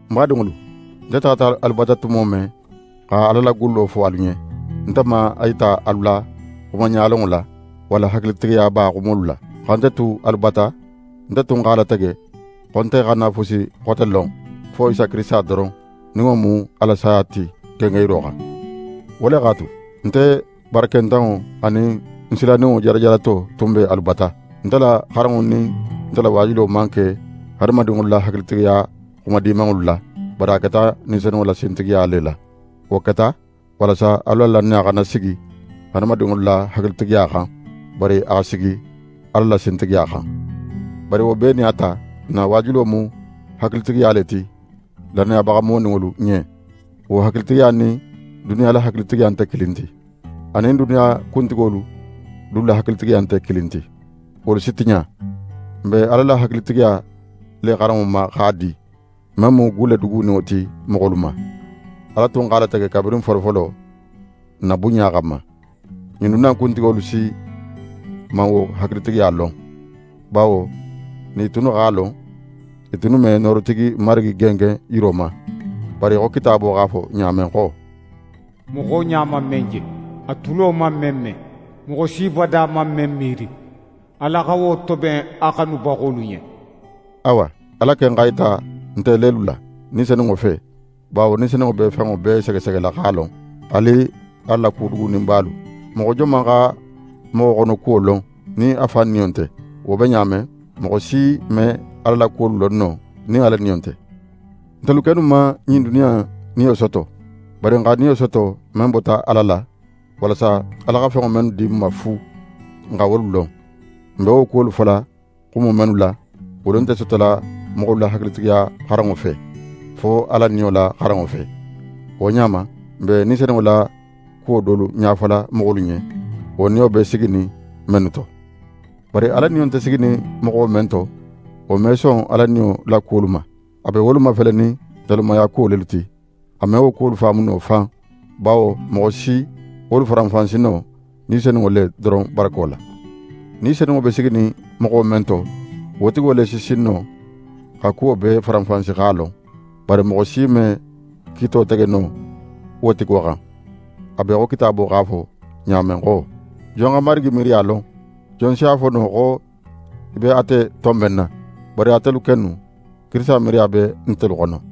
Ń badinŋolu, nte taxata alu bata tumo men xa Ala la gullo fo alu ɲen, nte man a yita alu la xumaɲalonŋo la, walla hakilitigiyaba xumolu la. Xa nte tu alu bata, nte tun x'a latege xo nte xana fusi xote lon, fo Isa Kirisita doron, nin wo mu a la saya ti gengenyiro xan. Wo le x'a tu, nte barakentanŋo anin ń silaninŋo jarajarato tun be alu bata. Nte la xaranŋo anin nte la waajulo man ke hadamadinŋolu la hakilitigiyaxuma dimanŋolu la; bari a keta Ni Senunŋo la sintigiya le la. Wo keta, walasa alu la lannaya xana sigi hadamadinŋolu la hakilitigiya xan, bari a xa sigi Ala la sintigiya xan. Bari wo bee nin a ta, n na waajulo mu hakilitigiya le ti lannayabaxa moninŋolu ɲen. Wo hakilitigiya nin duniya la hakilitigiya nte kilin ti. A nin duniya kuntigolu dulu la hakilitigiya nte kilin ti; wolu si tiɲa. N be Ala la hakilitigiya le xaranŋo ma x'a di, men mu gulle duguninŋo ti moxolu ma. Ala tun x'a latege kabirin folofolo n na bunɲa xanma. Ɲin duniya in kuntigolu si man wo hakilitigiya lon, bawo nin i tunnu x'a lon, i tunnu me noorotigi Marigi gengen yiro ma. Bari í xo Kitaabo x'a fo ɲa men xo: «Moxo ɲa man men je, a tulo man men me, moxo si bada man men miiri, Ala xa wo toben a xanubaxolu ɲen.» Awa, Ala ken x'a yita nte lelu la, Ni Senunŋo fe; bawo Ni Senunŋo be fenŋo bee segesegela x'a lon, haali Ala la ku duguninbalu. Moxo joman xa moxo xonokuwo lon nin a fan niyo nte? Wo be ɲa men, moxo si me Ala la kuwolu lon no nin Ala Niyo nte. Ntelu kennu man ɲin duniya in niyo soto; bari n xa Niyo soto men bota Ala la, walasa Ala xa fenŋo mennu di n ma fu, n xa wolu lon. N be wo kuwolu fola xumo mennu la, wolu nte sotola moxolu la hakilitigiya xaranŋo fe, fo Ala Niyo la xaranŋo fe. Wo ɲa ma, n be Ni Senunŋo la kuwo dolu ɲafola moxolu ɲen, wo Niyo be siginin mennu to. Bari Ala Niyo nte siginin moxo men to, wo me son Ala Niyo la kuwolu ma. A be wolu mafelenin nalumayakuwo lelu ti; a me wo kuwolu faamu no fan, bawo moxo si wolu faranfansi no Ni Senunŋo le doron barako la. Ni Senunŋo be siginin moxo men to, wo tigo le si sin no xa kuwo bee faranfansi x'a lon; bari moxo si me kiito tege no wo tigo xan. A be í xo Kitaabo x'a fo ɲa men xo: «Jon xa Marigi miiriya lon? Jon si a fo no xo í be ate tonbenna?» Bari ntelu kennu, Kirisita miiriya be ntelu xono.